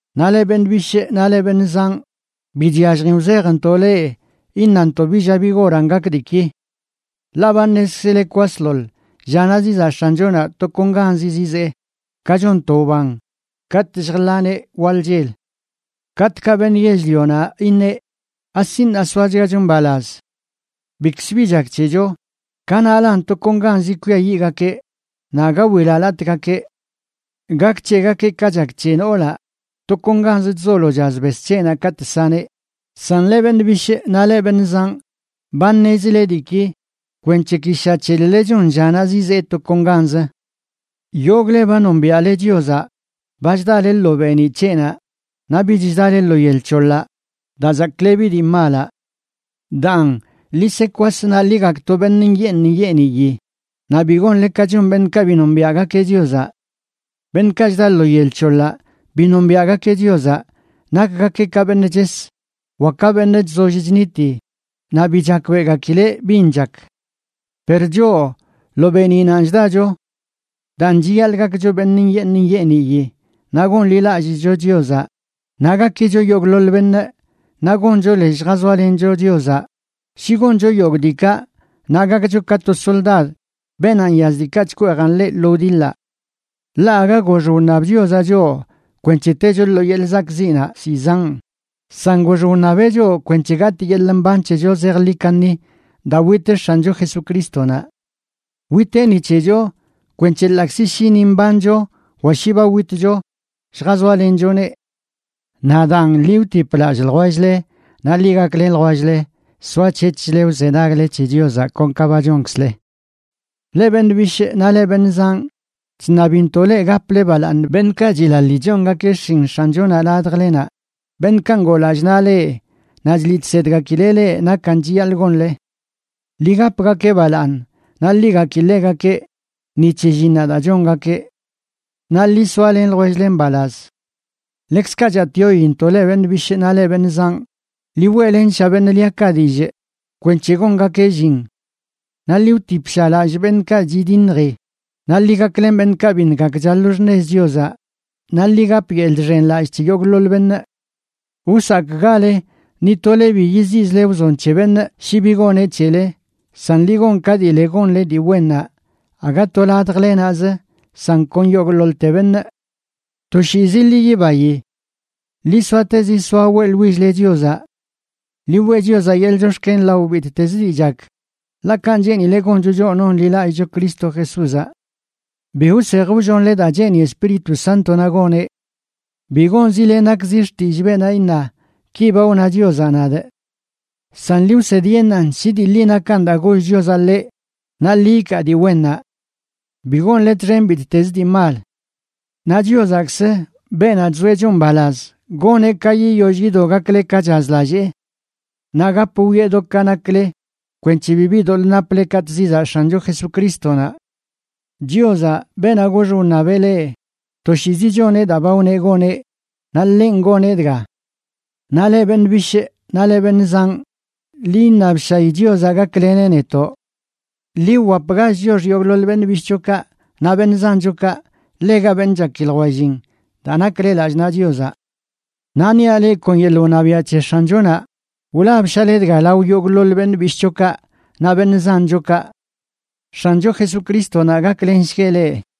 Naꞌ leꞌ beṉꞌ bishꞌ naꞌ leꞌ beṉꞌ zanꞌ, bi chyalljin wzejntoꞌ leꞌ iṉantoꞌ bi lla bi goranꞌ gak diiki. Ḻaꞌ ba ṉezkzile kwasḻoḻ llanaꞌ zizaꞌ X̱anchonaꞌ tokonganzi zizee, ka chon to wban katꞌ lljḻaneꞌ waḻ chel. Katꞌkaꞌ beṉꞌ yell-lionaꞌ iṉeꞌ: “Asi ṉaa zoachgacho mbalaz. Bikzbi chak c̱hecho”, kanaꞌlan tokonganzi kwiayiꞌgakeꞌ naꞌ aga wilalatꞌgakeꞌ. Gak c̱hegakeꞌ ka chak c̱he noolaꞌ tokonganzə chzolo chaz bes c̱heꞌnaꞌ katꞌ saneꞌ. San leꞌ beṉꞌ bishꞌ naꞌ leꞌ beṉꞌ zanꞌ, ba ṉezile diiki kwenc̱he ki sha c̱hel-lə chon llanaꞌ zizee tokonganzə. Yogꞌle ba nombiaꞌle Chiozaꞌ ba chdale lo beeniꞌ c̱heꞌnaꞌ, naꞌ bich chdale lo yel c̱hoḻaꞌ daa chzaklebi dii malaꞌ. Daan, ḻi se kwas naꞌ ḻi gakto beṉꞌ nyeeṉ nyeeniyi naꞌ bi gonle ka chon beṉꞌkaꞌ bi nombiaꞌgakeꞌ Chiozaꞌ. Beṉꞌkaꞌ chda lo yel c̱hoḻaꞌ bi nombiaꞌgakeꞌ Chiozaꞌ, nakgakeꞌ ka beṉꞌ ches wa ka beṉꞌ chzoll chniti naꞌ bi chakbeꞌgakileꞌ bin chak. Per choꞌ, lo beeniꞌnanꞌ chdacho. Daan, chiyaḻꞌ gakcho beṉꞌ nyeeṉ nyeeniyi, naꞌ gonḻilallꞌchcho Chiozaꞌ, naꞌ gakicho yogꞌḻoḻ beṉꞌ naꞌ goncho lez lljazoalencho Chiozaꞌ. Shi goncho yogꞌ diikaꞌ, naꞌ gakcho ka to soldad beenaꞌ nyaz diikaꞌ chkweejan ḻeꞌ lo wdiḻaꞌ. Ḻaꞌ aga gox wṉab Chiozaꞌ choꞌ kwenc̱he techo lo yeḻꞌ zakꞌziꞌnaꞌ zizanꞌ, san gox wṉabeꞌ choꞌ kwenc̱he gatꞌ yeḻꞌ mban c̱hecho zejḻi kaṉi daa wit X̱ancho Jesucrístonaꞌ. Witeꞌ ni c̱hecho kwenc̱he ḻaꞌkzi shi ni mbancho wa shi ba witcho, lljazoalenchoneꞌ. Naꞌ daan, ḻi wtip lallꞌ ljwell-le naꞌ ḻi gaklen ljwell-le soac̱hec̱hchle wzenagle c̱he Chiozaꞌ kon ka ba chonkzle. Leꞌ beṉꞌ bishꞌ naꞌ leꞌ beṉꞌ zanꞌ, chṉabintoꞌ leꞌ gaple balaaṉ beṉꞌkaꞌ chilaḻi chongakeꞌ xshin X̱anchonaꞌ ladjlenaꞌ, beṉꞌkaꞌ ngoo lallꞌ naꞌ leꞌ naꞌ chliꞌ chsedgakileꞌ leꞌ nakan chiyaḻꞌ gonle. Ḻi gapgakeꞌ balaaṉ naꞌ ḻi gaki ḻegakeꞌ ni c̱he llinnaꞌ daa chongakeꞌ. Naꞌ ḻi soalen ljwell-le mbalaz. Ḻekzkaꞌ chatꞌyointoꞌ leꞌ beṉꞌ bishꞌ naꞌ leꞌ beṉꞌ zanꞌ, ḻi weꞌlensha beṉꞌ liakaꞌ dillꞌ kwenc̱he gongakeꞌ llin. Naꞌ ḻi wtipsha lallꞌ beṉꞌkaꞌ chidiṉji, naꞌ ḻi gaklen beṉꞌkaꞌ biṉꞌ gakcha lo xṉez Chiozaꞌ, naꞌ ḻi gap yeḻꞌ chxenlallꞌ c̱he yogꞌḻoḻ beṉꞌ. Wsakꞌgale ni tole bi yiziꞌzle wzon c̱he beṉꞌ shi bi goneꞌ c̱hele, san ḻi gon ka dii le gonle dii wennaꞌ, aga to ladjle naꞌzə, san kon yogꞌḻoḻte beṉꞌ. Toshiizi ḻi yibayi. Ḻi soatezi soa weꞌḻwill-le Chiozaꞌ. Ḻi weꞌ Chiozaꞌ yeḻꞌ chox̱ken lao bittezə dii chak, ḻaꞌ kanꞌ cheenileꞌ goncho choꞌ nonḻilallꞌcho Cristo Jesúzaꞌ. Bi wsej wllonle daa cheeni Espíritu Sántonaꞌ goneꞌ. Bi gonzile nakzi xtillꞌ beenaꞌ iṉa: “Ki ba wna Chiozaꞌ nadꞌ.” San ḻi wsedyeṉꞌan shi dii ḻi nakan daa goll Chiozaꞌ ḻeꞌ naꞌ ḻi ikaa dii wennaꞌ. Bi gonle txen bittez dii mal. Naꞌ Chiozaꞌkzə, beenaꞌ chzoeꞌ choꞌ mbalaz, goneꞌ ka yiyoll yido gakle ka chazlallee. Naꞌ gap wwieꞌ do ka nakle kwenc̱he bibi doḻꞌ naple katꞌ zizaꞌ X̱ancho Jesucrístonaꞌ. Chiozaꞌ, beenaꞌ gox wṉabeꞌ leꞌ, toshiizi choneꞌ daa ba wneꞌ goneꞌ, naꞌ ḻenꞌ goneꞌ dga. Naꞌ leꞌ beṉꞌ bishꞌ naꞌ leꞌ beṉꞌ zanꞌ, ḻi iṉabshayi Chiozaꞌ gakleneꞌ netoꞌ. Ḻi wwapgach chiox yogꞌḻoḻ beṉꞌ bishꞌchokaꞌ naꞌ beṉꞌ zanchokaꞌ ḻega beṉꞌ chaki ljwellin daa nakle lallꞌ naꞌ Chiozaꞌ. Naꞌ niaꞌ leꞌ kon yeḻꞌ wṉabiaꞌ c̱he X̱anchonaꞌ wlabshale dga lao yogꞌḻoḻ beṉꞌ bishꞌchokaꞌ naꞌ beṉꞌ zanchokaꞌ. X̱ancho Jesucrístonaꞌ gaklensgueꞌ leꞌ.